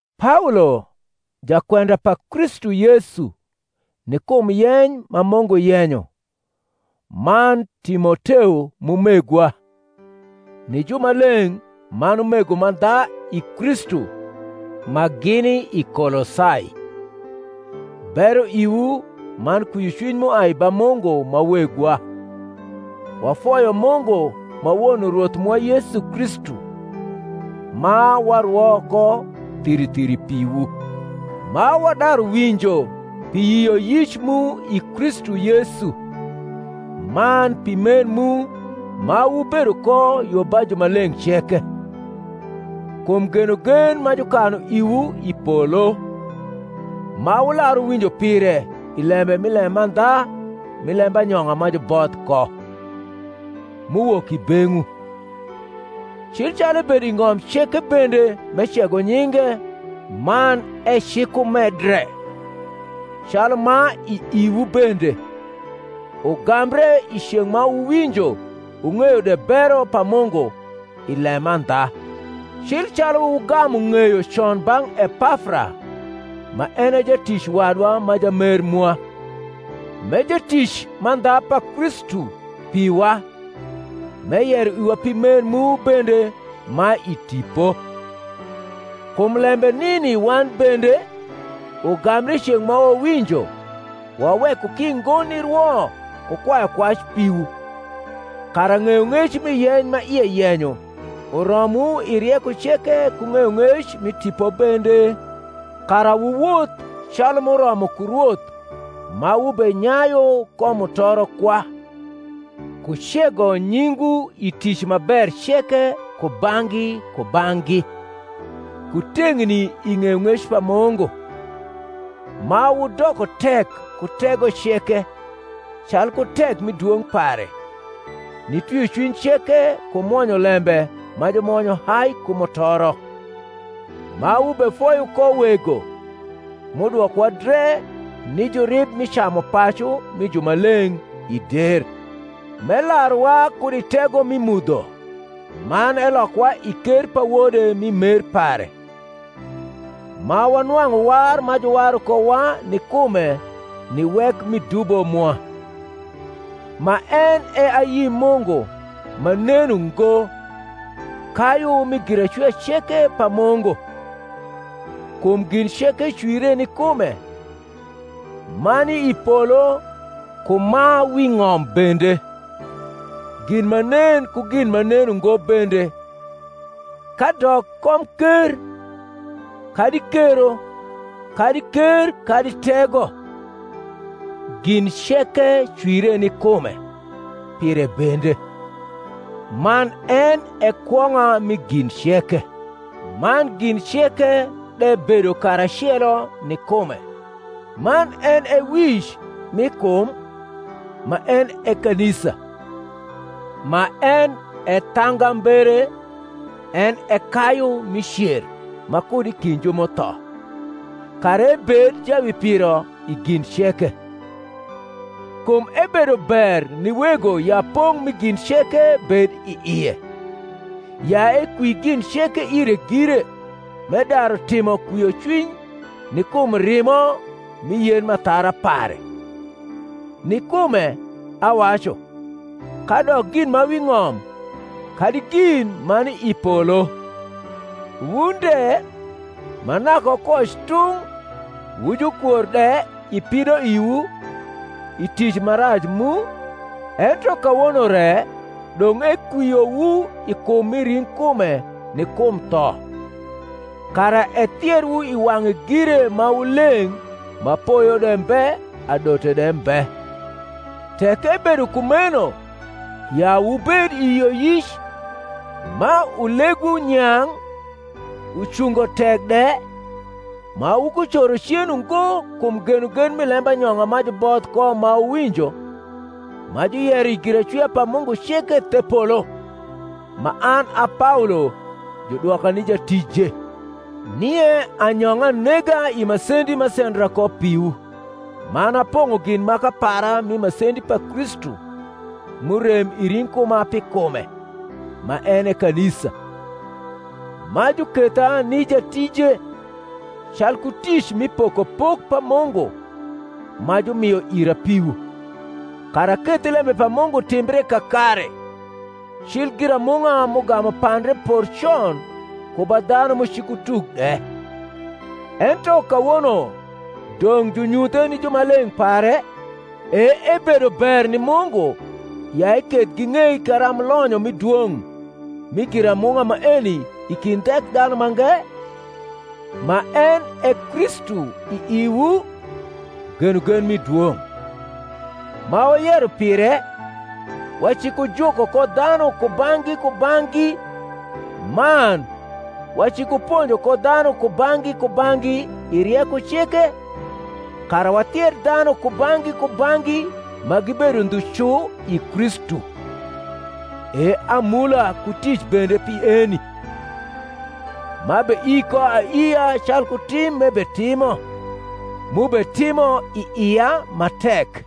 Paolo, jakwenda pa Kristu Yesu ni kum yeny ma Mungu yenyo, man Timoteo m’umegwa, ni jumaleng’ man umego mandha i Kristu ma gini i Kolosai: Bero iwu man kwiocwiny m’uai ba Mungu ma Wegwa. Wafoyo Mungu ma Won Rwoth mwa Yesu Kristu, ma warwo ko thiri thiri piwu, ma wadaru winjo pi yioyic mu i Kristu Yesu, man pi mer mu ma wubedo ko yo ba jumaleng’ ceke, kum genogen ma jukanu iwu i polo, ma wular wuwinjo pire i lembe mi lemandha mi lembanyong’a ma juboth ko, m’uwok i beng’wu: cil calu ebedo i ng’om ceke bende m’ecego nyinge man ecikumedre, calu ma i iwu bende, ugambre i ceng’ ma wuwinjo wung’eyo de bero pa Mungu i lemandha; cil calu wugamu ng’eyo con bang’ Epafra ma en e jatic wadwa ma jamer mwa, m’e jatic mandha pa Kristu piwa, m’eyero iwa pi mer mu bende ma i Tipo. Kum lembe nini wan bende, ugambre i ceng’ ma wawinjo, waweko ki ngo nirwo ku kwayu kwac piwu, kara ng’eyong’ec mi yeny ma ie yenyo uromwu i rieko ceke ku ng’eyong’ec mi tipo bende, kara wuwoth calu m’uromo ku Rwoth ma wubenyayu ko mutoro kwa, ku cego nyingwu i tic ma ber ceke kubang’gi kubang’gi, ku teng’ni i ng’eyong’ec pa Mungu; ma wudoko tek ku tego ceke, calku tek mi dwong’ pare, ni twiocwiny ceke ku mwonyolembe ma jumwonyo hai ku mutoro: ma wubefoyo ko Wego, m’udwokowa dre ni jurib mi camupacu mi jumaleng’ i der; m’elaruwa kud i tego mi mudho, man elokowa i ker pa Wode mi mer pare; ma wanwang’u war ma juwaru kowa ni kume, ni wek mi dubo mwa: ma en e ayi Mungu ma nen ungo, kayu mi giracwia ceke pa Mungu; kum gin ceke cwire ni kume, ma ni i polo ku ma wi ng’om bende, gin ma nen ku gin ma nen ungo bende, kadok komker kadi kero kadi ker kadi tego; gin ceke cwire ni kume, pire bende; man en e kwong’a mi gin ceke, man gin ceke de bedo karacelo ni kume. Man en e wic mi kum, ma en e kanisa: ma en e thangambere, en e kayu mi cer ma kud i kind ju m’utho; kara ebed jawipiro i gin ceke. Kum ebedo ber ni Wego ya pong’ mi gin ceke bed i ie; ya ekwi gin ceke ire gire, m’edaru timo kwiocwiny ni kum rimo mi yen m’athara pare; ni kume, awacu, kadok gin ma wi ng’om, kadi gin ma ni i polo. Wun de, ma naka wukoc tung’ wu jukwor de i pidoiwu i tic ma rac mu, ento kawono re dong’ ekwiowu i kum mi ring’kume ni kum tho, kara ethierwu i wang’e gire ma wu leng’ ma poyo de mbe adote de mbe: tek ebedo kumeno ya wubed i yioyic, ma ulegwu nyang’ ucungo tek de, ma wukucoro cen ungo kum genogen mi lembanyong’a ma juboth ko ma wuwinjo, ma juyero i giracwia pa Mungu ceke the polo; ma an a Paolo judwoka ni jatije. Nie anyong’a nega i masendi m’asendra ko piwu, man apong’o gin maka para mi masendi pa Kristu m’urem i ring’kuma pi kume, ma en e kanisa; ma juketha ni jatije, calku tic mi pokopok pa Mungu ma jumio ira piwu, kara aketh lembe pa Mungu timbre kakare, cil giramung’a m’ugamu pandre por con ku ba dhanu m’ucikutuk de: ento kawono dong’ junyuthe ni jumaleng’ pare, e ebedo ber ni Mungu ya eketh ging’ei karamb lonyo mi dwong’ mi giramung’a maeni i kind Thekdhanumange, ma en e Kristu i iwu, genogen mi dwong’: ma wayero pire, wacikujuko ko dhanu kubang’gi kubang’gi man wacikuponjo ko dhanu kubang’gi kubang’gi i rieko ceke, kara wathier dhanu kubang’gi kubang’gi ma gibedo ndhu cu i Kristu; e amula ku tic bende pi eni, m’abeii ko aiia calku tim m’ebetimo, m’ubetimo i ia ma tek.